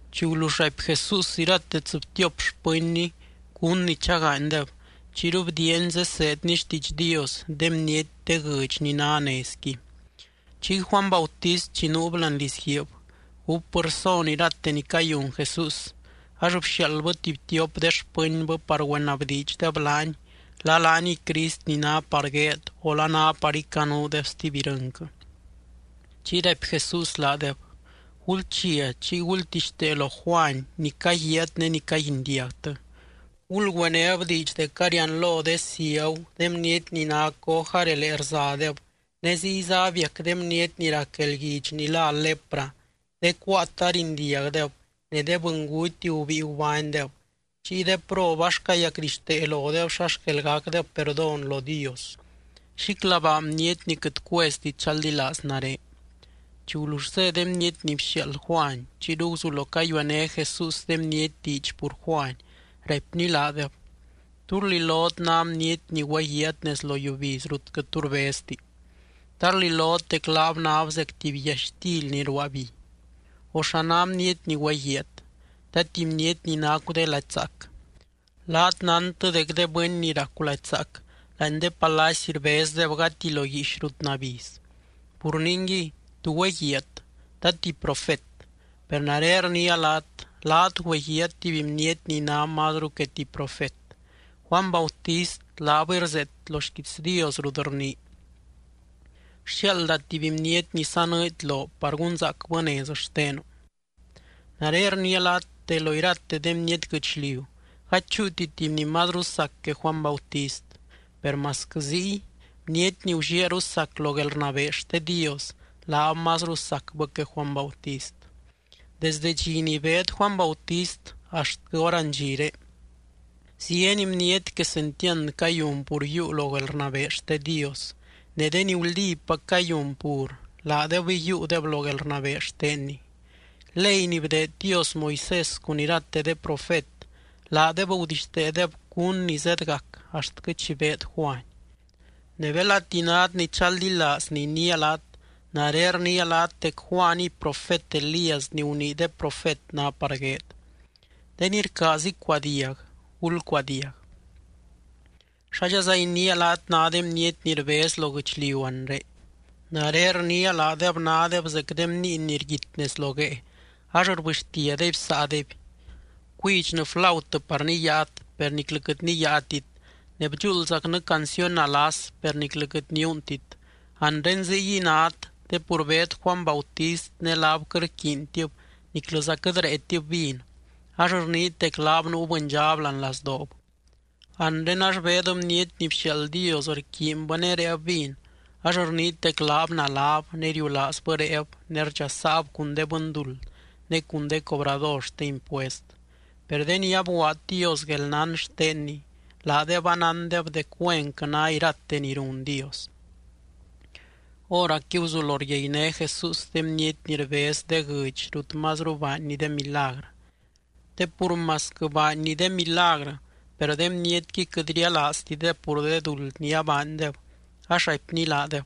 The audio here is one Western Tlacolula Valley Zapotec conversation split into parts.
Chi gulull raipy Jesús irate tsɨbtiop xpɨnny cún ni chagaanydeb, chiyru bdiiany zeseedny xtiidx Dios de bniety de guɨdx ni ná nezqui. Chiy Juany Bautist chi nuub láani lizguiib, gúpbɨ rson irate ni cayun Jesús. Ax bxiaaldbɨ tuby tiop de xpɨnbɨ par güenabdiidxdeb laany la laaniy Crist ni ná par gueed o la ná par icanuudeb stuby irɨnquɨ. Chiy raipy Jesús laadeb: —Gulchia chiy gultixtee lo Juany ni caguiaat ne ni caguindiagtɨ. Gulgüenéb diidx dec arianlo de ciagu, de bniety ni ná coj arelee rzadeb ne ziyza abiac de bniety ni rac guelguidx ni lá lepra, de cuaat arindiagdeb ne de bɨnguty gubíi gubánydeb, chiy de prob ax cayacdixtee lodeb xa xquel gacdeb perdón lo Dios. Xíclabaa bniety ni quɨt cuezti chaldilaaz nare. Chi gulull zé de bniety ni bxiaald Juany, chiyru guzulo cayuené Jesús de bniety diidx pur Juany, raipny laadeb: —¿Tú rlilot ná bniety ni güeguiaat nez lo yiubiz rut quɨt tu rbezti? ¿Ta rlilot dec laab náb zec tuby yaxtily ni ruaa bi? O ¿xa ná bniety ni güeguiaat? ¿Ta tuby bniety ni nacu de lady zaac? Laat nántɨ dec de bɨny ni racu lady zaac láani de palacy rbezdeb gati lo guiix rut nabiz. Pur ningui, ¿tú güeguiaat? ¿Ta tuby profet? Per nare rniia laat, laat güeguiaat tuby bniety ni ná mazru que tuby profet. Juany Bautist laabɨy rzeet lo xquiits Dios rut rnii: Rxiaalda tuby bniety ni sanɨɨdy loo par gunzaacbɨ nez xtenu. Nare rniia laat de lo irate de bniety guɨchliu, gady chúuti tuby ni mazru sac que Juany Bautist. Per masquɨ ziy, bniety ni gulliaaru sac lo guelrnabee xte Dios, laab mazru sacbɨ que Juany Bautist. Desde dxi ni beed Juany Bautist axtquɨ hórandxire, zieny bniety quesentiand cayun pur yiiu lo guelrnabee xte Dios. Ne de ni guldípac cayun pur, laadebɨy yiiudeb lo guelrnabee xtenny. Ley ni bdeed Dios Moisés cun irate de profet, laadeb gudixteedeb cún ni zedgac axtquɨ chi beed Juany. Ne belati nát ni chaldilaaz ni iniia laat, nare rniia laat dec Juaniy profet Elías ni gunii de profet ná par gueed. De ni rcaaz icuadiag, gulcuadiag. ’¿Xádxaza iniia laat ná de bniety ni rbez lo guɨchliu anre? Nare rniia, laadeb nádeb zec de bniiny ni rguit nez lo guee ax rbɨxtiadeby saadeby: “Bcuidxnɨ flautɨ par niyaat, per niclɨ quɨt niyaatit. Ne bdxuuldzacnɨ canciony nalas, per niclɨza quɨt niuuntit.” Anre ziyguiy nát te pur beed Juany Bautist ne laab quɨt rquiintib niclɨza quɨt réetib vin, ax rniit dec laab nuu bɨndxab láani lazdoob. Anre ax beed Bniety ni bxiaald Dios rquiinbɨ ne réeb vin ax rniit dec laab naláb, ne riulaazbɨ réeb, ne rdxasaab cun de bɨnduld ne cun de cobrador xte impuest. Per de ni abguaad Dios guelnán xtenny, laadeb anándeb dec güenquɨ ná irate ni run Dios. Hóracqui guzulo ryainé Jesús de bniety ni rbez de guɨdx rut mazru baanny de milagrɨ. Te pur masquɨ baanny de milagrɨ, per de bnietqui quɨt rialaaztideb pur de duld ni abaandeb, ax raipny laadeb: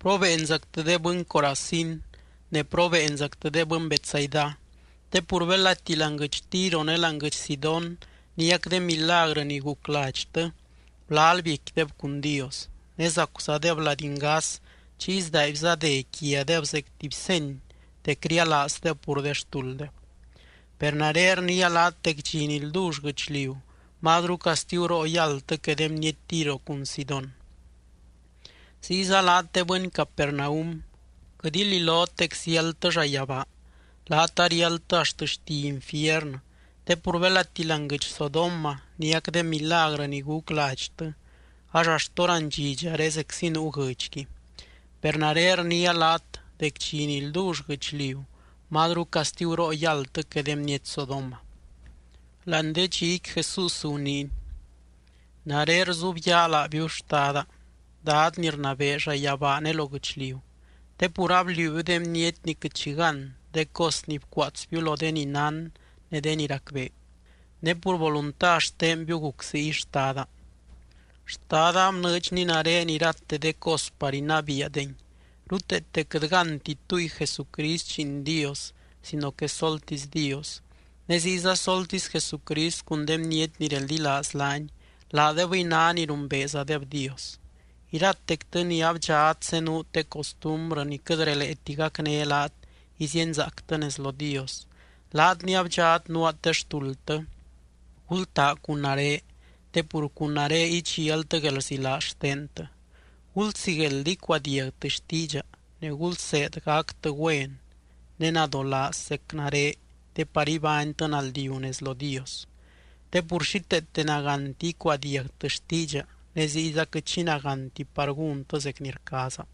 —¡Probeenzactɨ de bɨny Corazín! Ne, ¡probeenzactɨ de bɨny Betsaida! Te pur belati láani guɨdx Tiro ne láani guɨdx Sidón niac de milagrɨ ni guc ladxtɨ, gulal biecquideb cun Dios, ne zacuzadeb lady ngas chiy sdaaibza dé quiadeb zec tuby seny dec rialaazdeb pur de xtulddeb. Per nare rniia laat dec dxi ni ldull guɨchliu, mazru castiguroo yáldtɨ que de bniety Tiro cun Sidón. Ziyza laat de bɨny Capernaum, quɨt ililot dec ziáldtɨ llayabaa, laat ariáldtɨ axt xti infiernɨ. Te pur belati láani guɨdx Sodoma niac de milagrɨ ni guc ladxtɨ, ax axt hórandxidxare zeczi nuu guɨdxqui. Per nare rniia laat dec dxi ni ldull guɨchliu mazru castiguroo yáldtɨ que de bniety Sodoma. Láani de dxiqui Jesús guniiny: —Nare rzubyaa laabiu, Xtada, Dad ni rnabee llayabaa ne lo guɨchliu, te pur abliuubiu de bniety ni quɨt xi gán de cos ni bcuaatsbiu lo de ni nán ne de ni racbee. Ne pur volunta xtenbiu guc ziy, Xtada. ’Xtada abnɨɨdxny nare irate de cos par inabiiadengui. Ruteete quɨt gánti túy Jesucrist Lliin Dios sino que soltisy Dios, ne ziyza soltisy Jesucrist cun de bniety ni reldilaaz laany, laadebɨy ná ni rumbeezadeb Dios. Iratectɨ ni abdxat zenuut de costumbrɨ ni quɨt releeti gacné laat izíenzaactɨ nez lo Dios, laat ni abdxat nuaat de xtuldtɨ, gultaa cun nare te pur cun nare idxialtɨ guelrzilaaz xtentɨ. Gulsigueld icuadiagtɨ xtiidxa, ne gulseed gactɨ güen ne nadolaaz zec nare te par ibánytɨ naldiu nez lo Dios. Te pur xíteete nagánti icuadiagtɨ xtiidxa ne ziyza quɨt xi nagánti par gúntɨ zec ni rcaaza.